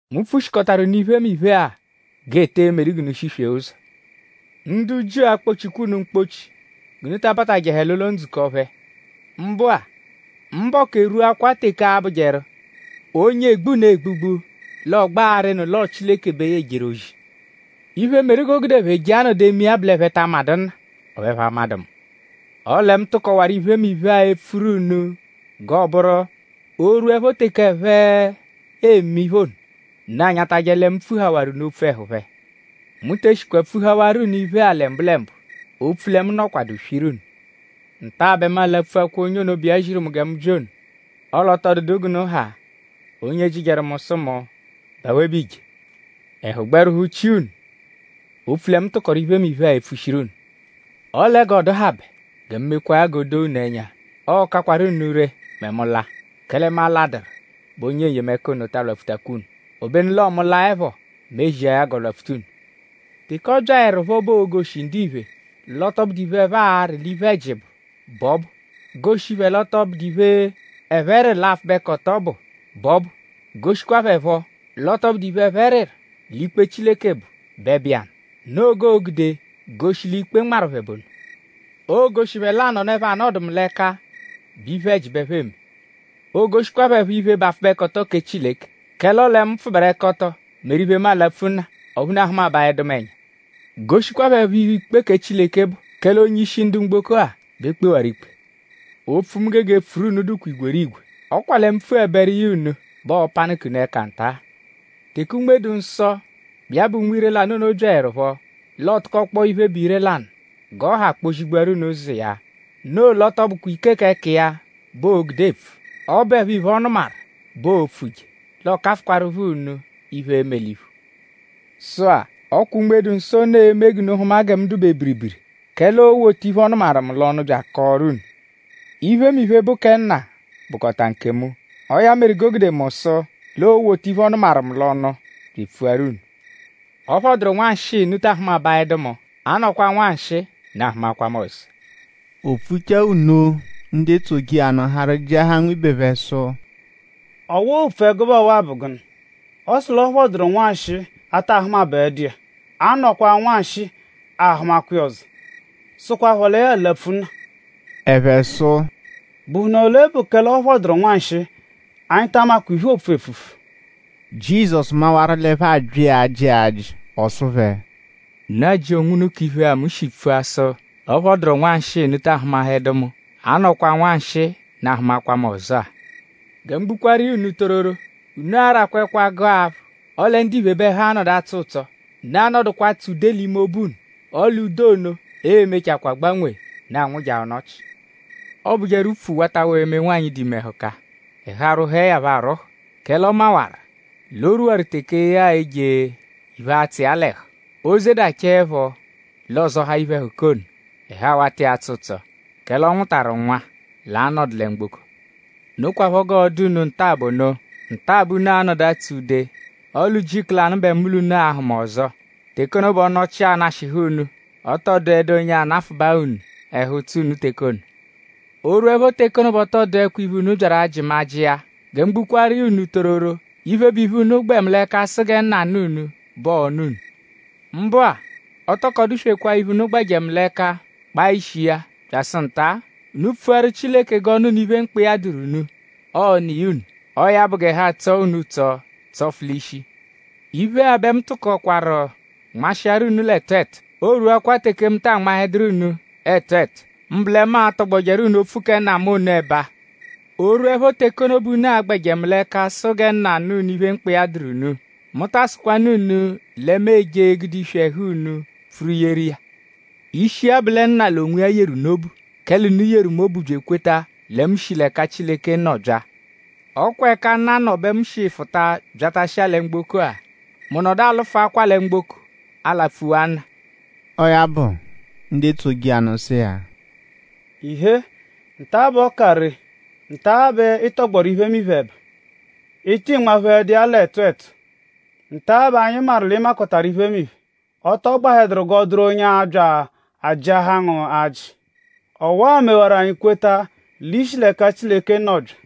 “Mu pfushikọtaru unu iphemiphe-a g'e tee medu unu g'unu shiswee ụzo. Ndu Jiu a-kpọ-chikwa unu mkpọ-chi g'unu ta abatajẹhe l'ụlo-ndzukọ phẹ. Mbụ-a; mbọku erwuakwaa teke a-bụjeru: onye egbu unu egbugbu l'ọ gbẹ arịnu l'ọo Chileke bẹ ya ejeru ozi. Iphe, meru g'o gude ẹphe je anọdu eme iya bụ l'ẹphe ta amadụ Nna; ọphu ẹphe amadụ mu. Ọle mu tụkowaru iphemiphe-a epfuru unu g'ọo-bụru: o -rwuẹpho teke ẹphe e-me iphe ono; unu anyatajẹ lẹ mu pfuhawaru unu opfu ẹhu phẹ.” Ozi, Unme-dụ-Nsọ ejeje “Mu te eshikwa pfuhawaaru unu iphe-a lẹ mbụlembu; opfu lẹ mu nọkwadu swiru unu. Nta-a bẹ mu alapfuakwa onye ono, bụ iya ziru mu gẹ mu bya ono. Ọle ọ tọ dụdu g'unu ha, onye jịjeru mu sụ mu:?bụ awe bẹ iije? Ẹhu gbẹ rwụhu-chia unu opfu lẹ mu tụkoru iphemiphe-a epfushiru unu. Ọle g'ọ dụhabe; gẹ mu mekwaa ya g'o doo unu ẹnya; ọ kakwaru unu ree mẹ mu -laa; kẹle mu aladuru bẹ Onye N-yemẹka ono ta alwapfutakwa unu. Obenu l'ọo mu -laẹpho; mu ezia ya g'ọ lwapfuta unu. Teke ọ byaẹrupho bẹ oo-goshi ndiphe l'ọ tọ bụdu iphe, ẹphe arị l'iphe-ẹji bụ bẹ ọ bụ; goshi phẹ l'ọ tọ bụdu iphe, ẹphe rịru l'apfụbekoto bụ bẹ ọ bụ; goshikwa phẹ phọ l'ọ tọ bụdu iphe, ẹphe rịru l'ikpe Chileke bụ bẹ bụ iya nụ. Noo g'oo-gude goshi l'ikpe nmarụ phẹ bụ ono. Oo-goshi phẹ l'anọno, ẹphe anọdu mu l'ẹka bụ iphe-ẹji bẹ ẹphe eme. Oo-goshikwa phẹ phọ iphe, bụ apfụbekoto kẹ Chileke; kẹle ọo lẹ mu pfụberekoto meru iphe, mu alapfu Nna; ọphu unu ahụmabaedu mu ẹnya. Goshikwa phẹ phọ iphe, ikpe kẹ Chileke bụ; kẹle onye-ishi ndu mgboko-a bẹ e kpewaru ikpe. “Opfu, mu gege epfuru unu dụkwa igwerigwe; ọ kwa lẹ mu -pfuẹberu iya unu bẹ ọo-panụka unu ẹka nta. Teke Unme-dụ-Nsọ, bụ iya bụ Unme ire-lanụ ono byaẹrupho; l'ọ tụkokpoo iphe, bụ ire-lanụ g'ọ ha kpọ-zigbuaru unu ụzo iya; noo l'ọ tọ bụkwa ike k'ẹka iya bẹ oo-gude epfu; ọ bụepho iphe, ọ nụmaru bụ iphe, oo-pfuje; l'ọ kafụkwaarupho unu iphe, e-me l'iphu. Sụ-a; ọ kwa Unme-dụ-Nsọ ono e-me g'unu hụma gẹ mu dụ-be biribiri; kẹle oo-wota iphe, ọ nụmaru mu l'ọnu bya akọoru unu. Iphemiphe, bụ kẹ Nna bụkota nkemu. Ọo ya meru g'o gude mu sụ l'oo-wota iphe, ọ nụmaru mu l'ọnu bya epfuaru unu. “Ọ phọduru nwanshịi; unu ta ahụmabaedu mu; a -nọkwaa nwanshịi; unu ahụmakwa mu ọzo.” O pfuchaa nno ndu etsoje iya nụ harụ jịahaa nwibe phẹ sụ: “?Ọwa-a, oopfu ẹgube ọwa-a bụ gụnu??Ọ sụ l'ọ phọduru nwanshịi; a taa hụmahedu iya; a -nọkwaa nwanshịi; a hụmakwa iya ọzo; sụkwapho lẹ ya alapfu Nna.” Ẹphe sụ: “?Bụhunu ole bụ kẹ l'ọ phọduru nwanshịi? Anyi ta amakwa iphe, oopfu epfupfu.” Jizọsu mawaru l'ẹphe abya iya ajị ajị; ọ sụ phẹ: “?Unu ajị onwunu k'iphe-a, mu shi pfua sụ l'ọ phọduru nwanshịi; unu taa hụmahedu mu; a -nọkwaa nwanshịi; unu ahụmakwa mu ọzo-a? Gẹ mu gbukwaaru iya unu tororo; unu a-rakwa ẹkwa; gụa aphụ; ọle ndiphe bẹ ẹhu a-nọdu atsọ ụtso. Unu a-nọdukwa atsụ ude l'ime obu; ọle ude ono e-mechakwaa gbanwee; unu anwụjaa ọnochi. Ọobujeru upfu watawaa eme nwanyị, dụ ime ẹhuka; ẹhu arwụhue ya phọ arwụhu; kẹle ọ mawaru l'o rwuwaru teke ya e-je iphe, a-tsụ iya l'ẹhu. O -zedachaẹpho; l'ọ zọhaa iphe-ẹhuka ono. Ẹhu awata iya atsọ ụtso; kẹle ọ nwụtaru nwa, l'a-nọdu lẹ mgboko. Nokwaphọ g'ọ dụ unu nta-a bụ ono. Nta-a bẹ unu a-nọdu atsụ ude; ọle ujiku lanụ bẹ mu l'unu a-hụma ọzo; teke ono bẹ ọnochi a-nashịhu unu. Ọ tọ dụedu onye anafụbaa unu ẹhu-ụtso unu teke ono. “O -rwuẹpho teke ono bẹ ọ tọ dụekwa iphe, unu byaru ajị mu ajị iya. Gẹ mu gbukwaaru iya unu tororo; iphe, bụ iphe, unu gbẹ mu l'ẹka sụ gẹ Nna nụ unu bẹ ọo-nụ unu. Mbụ-a; o tokọ dụ-swekwaa iphe, unu gbẹje mu l'ẹka kpaa ishi iya byasụ nta. Unu pfuaru Chileke g'ọ nụ unu iphe, mkpa iya dụru unu; ọo-nụ iya unu. Ọo ya bụ g'ẹhu atsọo unu ụtso tsọfu l'ishi.” “Iphe-a bẹ mu tụkokwaru nmashịaru unu l'ẹtu ẹtu. Oo rwuakwa teke mu taa nmahẹduru unu ẹtu ẹtu; mbụ lẹ mu atọgbojeru unu opfu kẹ Nna mu ono ẹba. O -rwuẹpho teke ono bẹ unu a-gbẹje mu l'ẹka sụ gẹ Nna nụ unu iphe, mkpa iya dụru unu; mu ta asụkwanu unu lẹ mu e-je egude iswi ẹhu unu pfuru yeru iya. Ishi iya bụ lẹ Nna l'onwiya yeru unu obu; kẹle unu yeru mu obu bya ekweta lẹ mu shi l'ẹka Chileke nọ bya. Ọ kwa ẹka Nna nọ bẹ mu shi fụta byatashia lẹ mgboko-a; mu nọdu alụfuakwa lẹ mgboko alapfuwa Nna.” Ọo ya bụ; ndu etsoje iya nụ sụ iya: “Ịhee; nta-a bẹ ọ ka ree; nta-a bẹ ị tọgbochaaru iphemiphe ẹba; ị tị nmaphehẹdu iya l'ẹtu ẹtu. Nta-a bẹ anyi maru l'ị makọtaru iphemiphe. Ọ tọ gbahẹduru g'ọ dụru onye abya ajịahaa ngu ajị. Ọwa mewaru; anyi kweta l'i shi-a l'ẹka Chileke nọ bya.”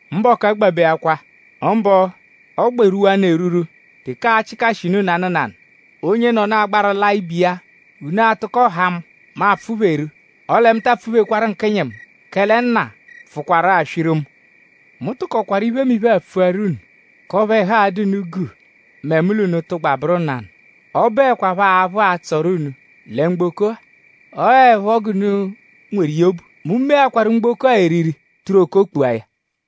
Mbọku agbabeakwa; mbụ ọ gbẹ rwuwanụ erwurwu teke aa-chịkashi unu nanụ nanụ; onyenọnu agbaru laa ibe iya; unu atụko haa mu; mu apfụ-pheru. Ọle mu ta apfụ-phekwaru nkịnyi mu; kẹle Nna pfụkwaru-a swiru mu. Mu tụkokwaru iphe-a pfuaru unu; k'ọphu ẹhu a-dụ unu guu mẹ mu l'unu -tụgba bụru nanụ. Ọ bụekwapho aphụ a-tsụru unu lẹ mgboko-a; ọoepho g'unu nweru iya obu. Mu meakwaru mgboko-a eriri; tụru okoo kpua ya.”